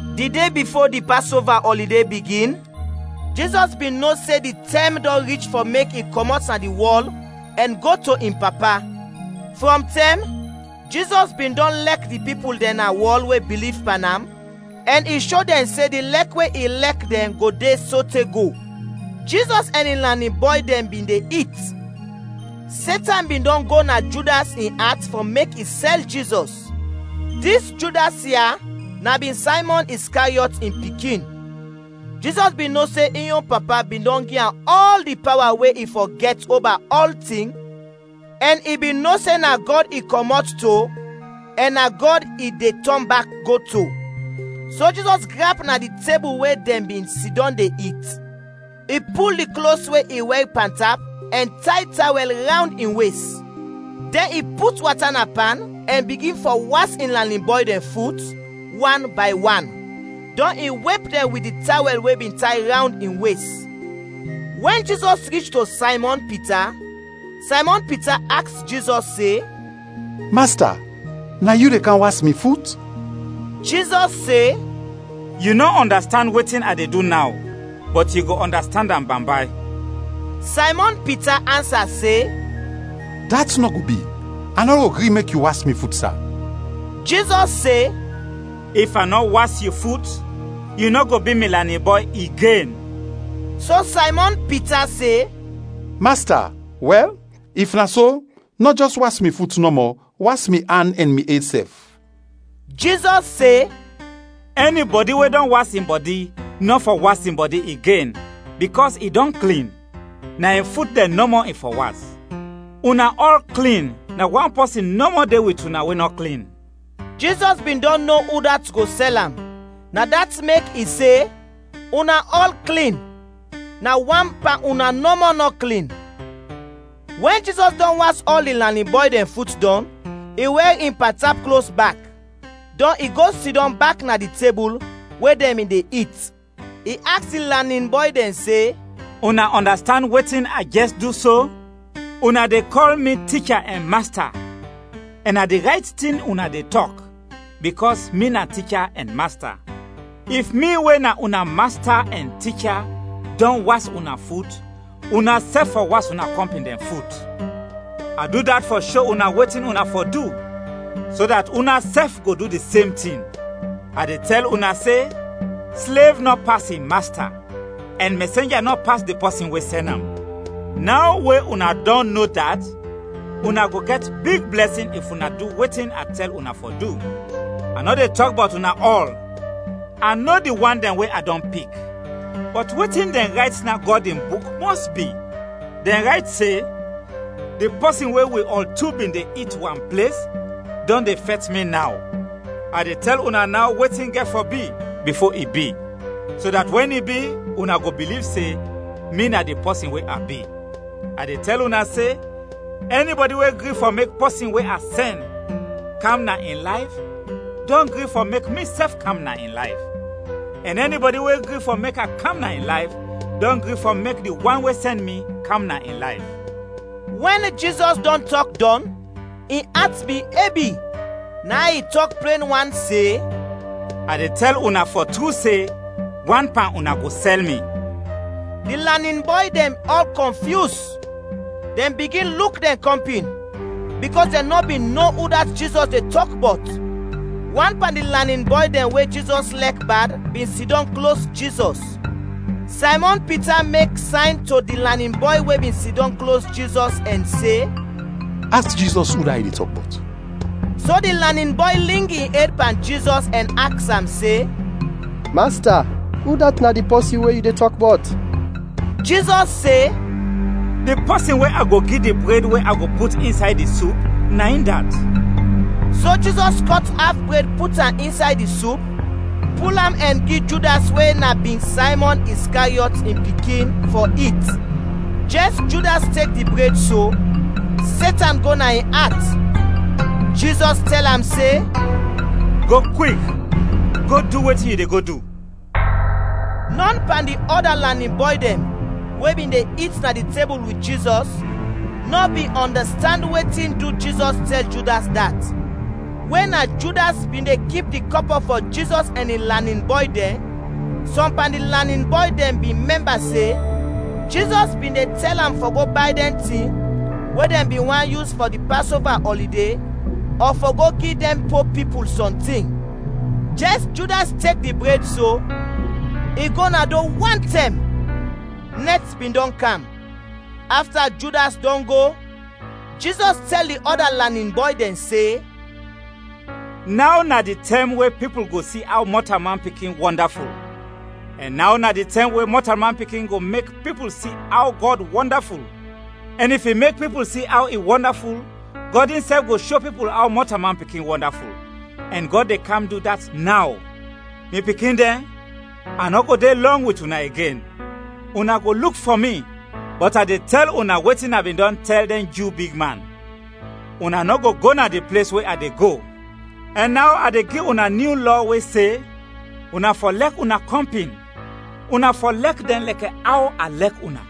Di de bifo di Pasova ɔlide bigin, Jizɔs bin no se di tɛm dɔn rich fɔ mek i kɔmɔt na dis wɔl ɛn go to in Papa. Frɔm tɛm, Jizɔs bin dɔn lɛk di pipul dɛn na wɔl we biliv pan am, ɛn i sho dɛn se di lɛk we i lɛk dɛn go de sote go. Jizɔs ɛn in lanin bɔy dɛn bin de it. Setan bin dɔn go na Judas in at fɔ mek i sɛl Jizɔs. Dis Judas ya na bin Saymɔn Iskariɔt in pikin. Jizɔs bin no se in yon Papa bin dɔn gi am ɔl di pawa we i fɔ gɛt oba ɔltin, ɛn i bin no se na Gɔd i kɔmɔt to ɛn na Gɔd i de tɔn bak go to. So Jizɔs grap na di tebul we dɛn bin sidɔm de it. I pul di klos we i wɛr pantap ɛn tay tawɛl rawnd in wes. Dɛn i put wata na pan, ɛn bigin fɔ was in lanin bɔy dɛn fut, wan bay wan, dɔn i wep dɛn wit di tawɛl we bin tay rawnd in wes. Wɛn Jizɔs rich to Saymɔn Pita, Saymɔn Pita aks Jizɔs se, “Masta, na yu de kam was mi fut?” Jizɔs se, “Yu nɔ ɔndastand wetin a de du naw, bɔt yu go ɔndastand am bambay.” Saymɔn Pita ansa se, “Dat nɔ go bi, a nɔ go gri mek yu was mi fut, sa!” Jizɔs se, “If a nɔ was yu fut, yu nɔ go bi mi lanin bɔy igen.” So Saymɔn Pita se, “Masta, wɛl, if na so, nɔ jɛs was mi fut nɔmɔ, was mi an ɛn mi ed sɛf.” Jizɔs se, “Ɛnibɔdi we dɔn was in bɔdi, nɔ fɔ was in bɔdi igen, bikɔs i dɔn klin, na in fut dɛn nɔmɔ i fɔ was. Una ɔl klin, na wan pɔsin nɔmɔ de wit una we nɔ klin,” (Jizɔs bin dɔn no udat go sɛl am, na dat mek i se, “Una ɔl klin, na wan pan una nɔmɔ nɔ klin.”) Wɛn Jizɔs dɔn was ɔl di lanin bɔy dɛn fut dɔn, i wɛr in pantap klos bak, dɔn i go sidɔm bak na di tebul, we dɛn bin de it. I aks di lanin bɔy dɛn se, “Una ɔndastand wetin a jɛs du so? Una de kɔl mi Ticha ɛn Masta, ɛn na di rayt tin una de tɔk, bikɔs mi na Ticha ɛn Masta. If mi, we na una Masta ɛn Ticha, dɔn was una fut, unasɛf fɔ was una kɔmpin dɛn fut. A du dat fɔ sho una wetin una fɔ du, so dat unasɛf go du di sem tin. A de tɛl una se: Slev nɔ pas in masta, ɛn mɛsenja nɔ pas di pɔsin we sɛn am. Naw we una dɔn no dat, una go gɛt big blɛsin if una du wetin a tɛl una fɔ du. “A nɔ de tɔk bɔt una ɔl; a no di wan dɛn we a dɔn pik. Bɔt wetin dɛn rayt na Gɔd in Buk mɔs bi. Dɛn rayt se, ‘Di pɔsin we wi ɔl tu bin de it wan ples, dɔn de fɛt mi naw.’ A de tɛl una naw wetin gɛt fɔ bi, bifo i bi, so dat wɛn i bi, una go biliv se, ‘Mi na di pɔsin we a bi.’ A de tɛl una se, ɛnibɔdi we gri fɔ mek pɔsin we a sɛn, kam na in layf, dɔn gri fɔ mek misɛf kam na in layf; ɛn ɛnibɔdi we gri fɔ mek a kam na in layf, dɔn gri fɔ mek di wan we sɛn mi, kam na in layf.” Wɛn Jizɔs dɔn tɔk dɔn, in at bin ebi, na in i tɔk plen wan se, “A de tɛl una fɔ tru se, wan pan una go sɛl mi.” Di lanin bɔy dɛn ɔl kɔnfyus, dɛn bigin luk dɛn kɔmpin, bikɔs dɛn nɔ bin no udat Jizɔs de tɔk bɔt. Wan pan di lanin bɔy dɛn we Jizɔs lɛk bad bin sidɔm klos Jizɔs. Saymɔn Pita mek sayn to di lanin bɔy we bin sidɔm klos Jizɔs ɛn se, “Aks Jizɔs udat i de tɔk bɔt.” So di lanin bɔy ling in ed pan Jizɔs ɛn aks am se, “Masta, udat na di pɔsin we yu de tɔk bɔt?” Jizɔs se, “Di pɔsin we a go gi di bred we a go put insay di sup, na in dat.” So Jizɔs kɔt af bred put am insay di sup, pul am ɛn gi Judas we na bin Saymɔn Iskariɔt in pikin, fɔ it. Jɛs Judas tek di bred so, Setan go na in at. Jizɔs tɛl am se, “Go kwik, go du wetin yu de go du!” Nɔn pan di ɔda lanin bɔy dɛn we bin de it na di tebul wit Jizɔs, nɔ bin ɔndastand wetin du Jizɔs tɛl Judas dat. We na Judas bin de kip di kɔpɔ fɔ Jizɔs ɛn in lanin bɔy dɛn, sɔm pan di lanin bɔy dɛn bin mɛmba se Jizɔs bin de tɛl am fɔ go bay dɛn tin we dɛn bin want yus fɔ di Pasova ɔlide ɔ fɔ go gi dɛn po pipul sɔntin. Jɛs Judas tek di bred so, i go na do wantɛm. Nɛt bin dɔn kam. Afta Judas dɔn go, Jizɔs tɛl di ɔda lanin bɔy dɛn se, “Naw na di tɛm we pipul go si aw Mɔtalman Pikin wɔndaful; ɛn naw na di tɛm we Mɔtalman Pikin go mek pipul si aw Gɔd wɔndaful. Ɛn if i mek pipul si aw i wɔndaful, Gɔd insɛf go sho pipul aw Mɔtalman Pikin wɔndaful, ɛn Gɔd de kam du dat naw. Mi pikin dɛn, a nɔ go de lɔng wit una igen, una go luk fɔ mi, bɔt a de tɛl una wetin a bin dɔn tɛl dɛn Ju bigman, ‘Una nɔ go go na di ples we a de go.’ Ɛn naw a de gi una nyu lɔ we se: Una fɔ lɛk una kɔmpin. Una fɔ lɛk dɛn lɛkɛ aw a lɛk una.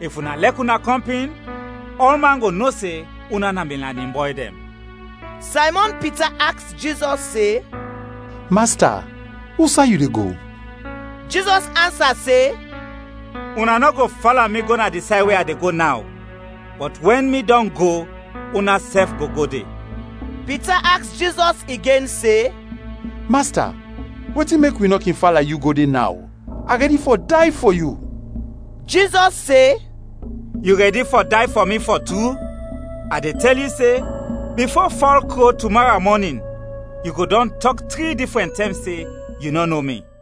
If una lɛk una kɔmpin, ɔlman go no se una na mi lanin bɔy dɛn.” Saymɔn Pita aks Jizɔs se, “Masta, usay yu de go?” Jizɔs ansa se, “Una nɔ go fala mi go na di say we a de go naw, bɔt wɛn mi dɔn go, unasɛf go go de.” Pita aks Jizɔs igen se, “Masta, wetin du wi nɔ kin fala yu go de naw? A rɛdi fɔ day fɔ yu!” Jizɔs se, “Yu rɛdi fɔ day fɔ mi, fɔ tru? A de tɛl yu se, bifo fɔl kro tumara mɔnin, yu go dɔn tɔk tri difrɛn tɛm se yu nɔ no mi.”